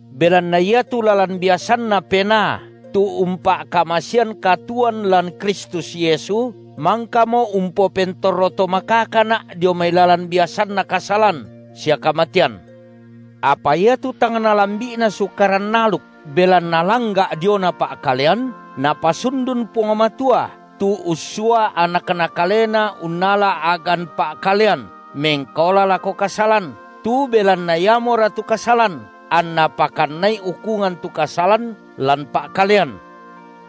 Belanna iatu lalan biasanNa Penaa tu umpa’kamasean katuoan lan Kristus Yesu mangkamo umpopentorro to makakana’ dio mai lalan biasanna kasalan sia kamatean. Apa iatu tang nalambi’na Sukaran aluk, belanna langga’ diona pa’kalean, Napasundun Puang Matua, tu ussua AnakNa kaleNa unnala a’gan pa’kalean mengkaola lako kasalan, tu belanna iamoratu kasalan, anNa pakannai ukungan tu kasalan, lan pa’kalean,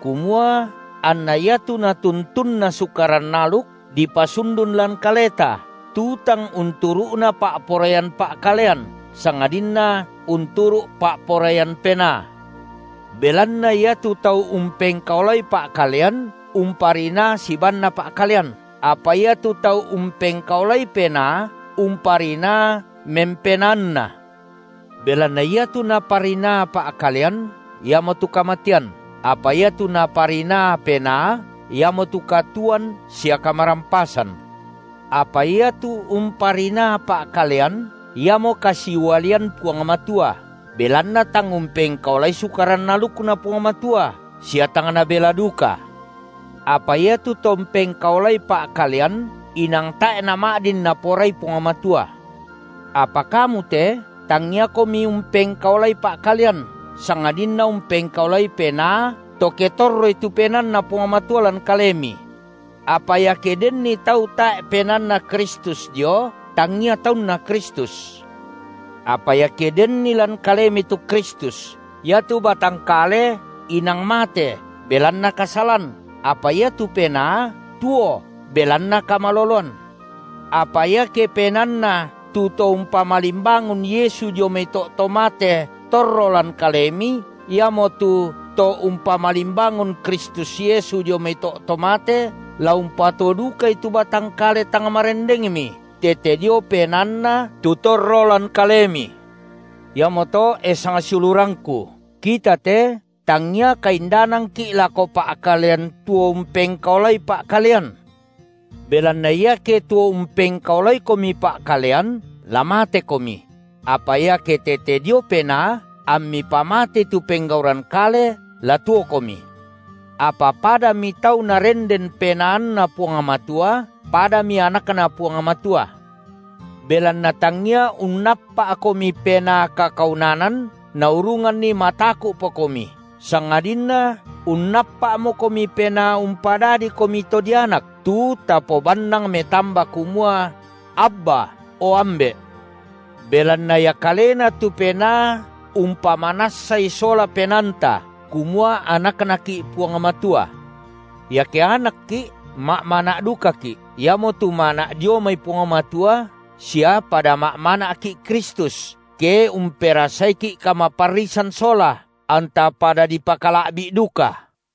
kumua anna iatu natuntunna Sukaran aluk dipasundun lan kaleta, tu tang unturu’na pa’poraian pa’kalean, sangadinna unturu’ pa’poraian Penaa. Belanna iatu tau umpengkaolai pa’kalean umparinaa sibaanna pa’kalean, apa iatu tau umpengkaolai Penaa, umparinaa memPenaanna. Belanna iatu naparinaa pa’kalean iamotu kamatean, apa iatu naparinaa Penaa iamotu katuoan sia kamarampasan. Apa iatu umparinaa pa’kalean iamo kasiualian Puang Matua, belanna tang umpengkaolai Sukaran alukNa Puang Matua, sia tang nabela duka. Iatu to umpengkaolai pa’kalean inang tae’ nama’din Naporai Puang Matua. Apa kamu te tangiakomi umpengkaolai pa’kalean, sangadinna umpengkaolai Penaa to ke torroi tu PenaanNa Puang Matua lan kalemi. Apa iake denni tau tae’ PenaanNa Kristus dio, tangia taunna Kristus. Apa iake denni lan kalemi tu Kristus, iatu batang kale inang mate belanna kasalan, apa iatu penaa tuo belanna kamaloloan. Apa iake PenaanNa tu To umpamalimbangun Yesu dio mai to’ to mate torro lan kalemi, iamotu To umpamalimbangun Kristus Yesu dio mai to’ to mate, la umpatuo dukai tu batang kale tang marendengmi tete dio PenaanNa tu torro lan kalemi. Iamoto e sangsiulurangku, kita te tangia kaindanangki’ lako pa’kalean tuo umpengkaolai pa’kalean. Belanna iake tuo umpengkaolaikomi pa’kalean, la matekomi; apa iake tete dio Penaa, ammi pamatei tu penggauran kale, la tuokomi. Apa padami tau Narenden PenaanNa Puang Matua, padami anakNa Puang Matua. Belanna tangia unnappa’komi penaa kakaunanan naurunganni mataku’pokomi, sangadinna unnappa’mokomi Penaa umpadadikomi to dianak, tu tabannang metamba kumua: Abba, o Ambe’! Belanna Ia kalena tu Penaa umpamanassai sola penaanta, kumua anakNaki’ Puang Matua. Iake anakki’, ma’mana’ dukaki’, iamotu mana’ dio mai Puang Matua sia pada ma’mana’ki’ Kristus, ke umperasaiki’ kamaparrisan sola, anta pada dipakala’bi’duka.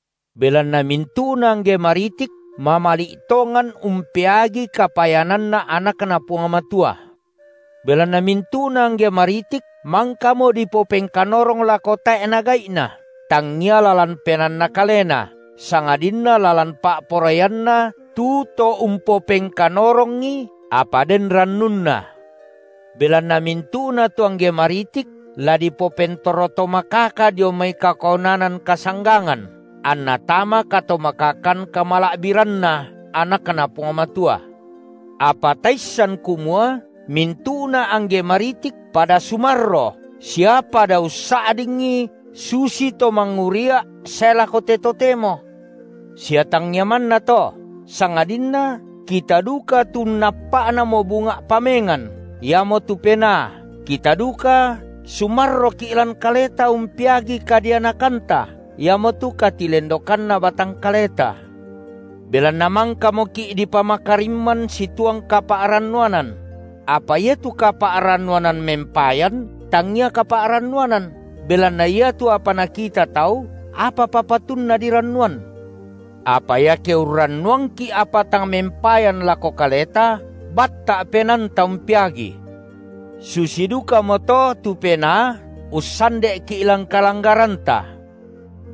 Belanna mintu’na angge maritik mamali’ tongan umpeagi kapayananna anakNa Puang Matua. Belanna mintu’na angge maritik mangkamo dipopengkanorong lako tae’na gai’na, tangia lalan penaanna kalena, sangadinna lalan pa’poraianNa tu To umpopengkanorongi, apa den rannunna, belanna mintu’na tu angge maritik la dipopentorro to makaka dio mai kakaunanan kasanggangan, anna tama katomakakan kamala’biranNa anakNa Puang Matua. Apa taissan kumua mintu’na angge maritik pada sumarro sia pada ussa’dingi susito mangurria’ sae lako te totemo. Sia tangia manna to, sangadinna kita duka tu unnappa’namo bunga’ pamengan –, iamotu Penaa, kita duka sumarroki’ lan kaleta umpeagi kadianakanta, iamotu katilendokanna batang kaleta. Belanna mangkamoki’ dipamakarimman situang kapa’rannuanan; apa iatu kapa’rannuanan mempayan tangia kapa’rannuanan, belanna iatu apa nakita tau, apapa patunna dirannuan? Apa iake urrannuangki’ apa tang mempayan lako kaleta, batta’ penaanta umpeagii. Susi dukamoto tu Penaa ussande’ki’ lan kalanggaranta.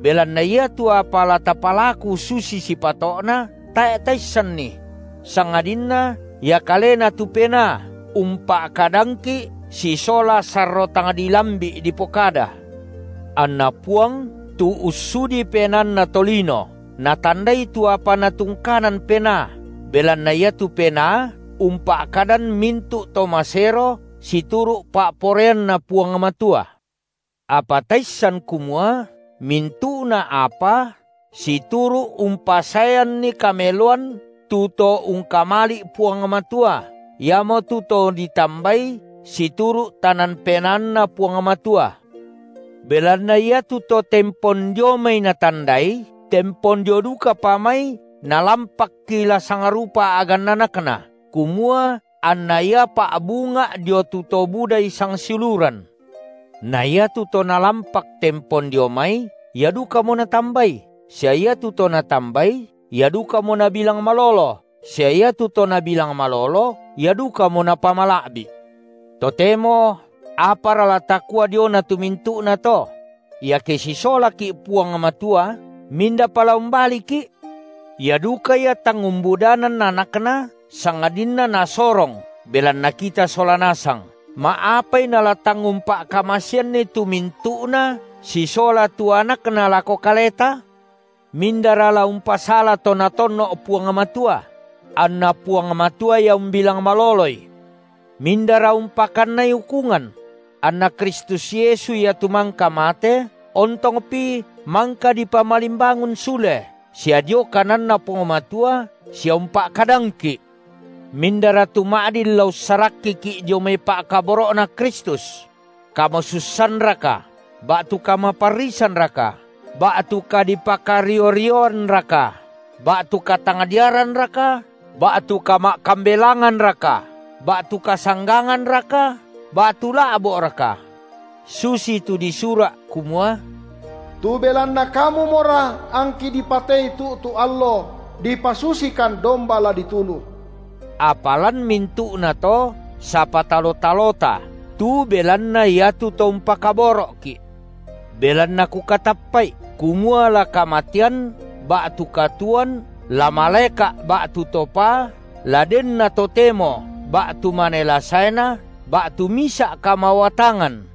Belanna iatu apa la tapalaku susi sipato’na, tae’ taissanni; sangadinna Ia kalena tu Penaa umpa’kadangki’ sisola sarro tang dilambi’ dipokada. Anna Puang, tu ussudi penaanna tolino, Natandai tu apa Natungkanan Penaa, belanna iatu Penaa umpa’kadan mintu’ to masero situru’ pa’poraianNa Puang Matua. Apa taissan kumua mintu’na apa situru’ umpasaeanni kameloan tu to ungkamali’ Puang Matua, iamotu to ditambai situru’ tanan penaanNa Puang Matua. Belanna iatu to tempon dio mai Natandai, tempon dio dukapa mai Nalampakki la sangrupa a’ganna AnakNa, kumua anna Ia pa’bunga’ dio tu to budai sangsiuluran. Na iatu to Nalampak tempon dio mai, ia dukamo Natambai, sia iatu to Natambai, ia dukamo Nabilang malolo, sia iatu to Nabilang malolo, ia dukamo Napamala’bi’. Totemo apara la takua diona tu mintu’nato? Iake sisolaki’ Puang Matua mindapa la umbaliki? Ia duka Ia tang umbudanan AnakNa sangadinna Nasorong belanna kita sola nasang, ma’apai Nala tang umpa’kamaseanni tu mintu’na sisola tu AnakNa lako kaleta? Mindara la umpasala to Natonno’ Puang Matua? Anna Puang Matua Ia umbilang maloloi. Mindara umpakannai ukungan? AnNa Kristus Yesu Ia tu mangka mate, ontongpi mangka dipamalimbangun sule, sia dio kananNa Puang Matua, sia umpa’kadangki’. Mindara tu ma’din la ussarakkiki’ dio mai pa’kaboro’Na Kristus? kamasussanraka ba’tu kamaparrisanraka, ba’tu kadipakario-rioanraka, ba’tu katangdiaranraka, ba’tu kama’kambelanganraka, ba’tu kasangganganraka, ba’tu la’bo’raka? Susitu disura’ kumua: Tu belanna Kamumora angki dipatei tu’tu’ allo; dipasusikan domba la ditunu. Apa lan mintu’nato sapatalo-talota tu belanna iatu To umpakaboro’ki’. Belanna kukatappa’i, kumua la kamatean, ba’tu katuoan, la malaeka’ ba’tu to paa, la denna totemo ba’tu mane la saena, ba’tu misa’ kamawatangan,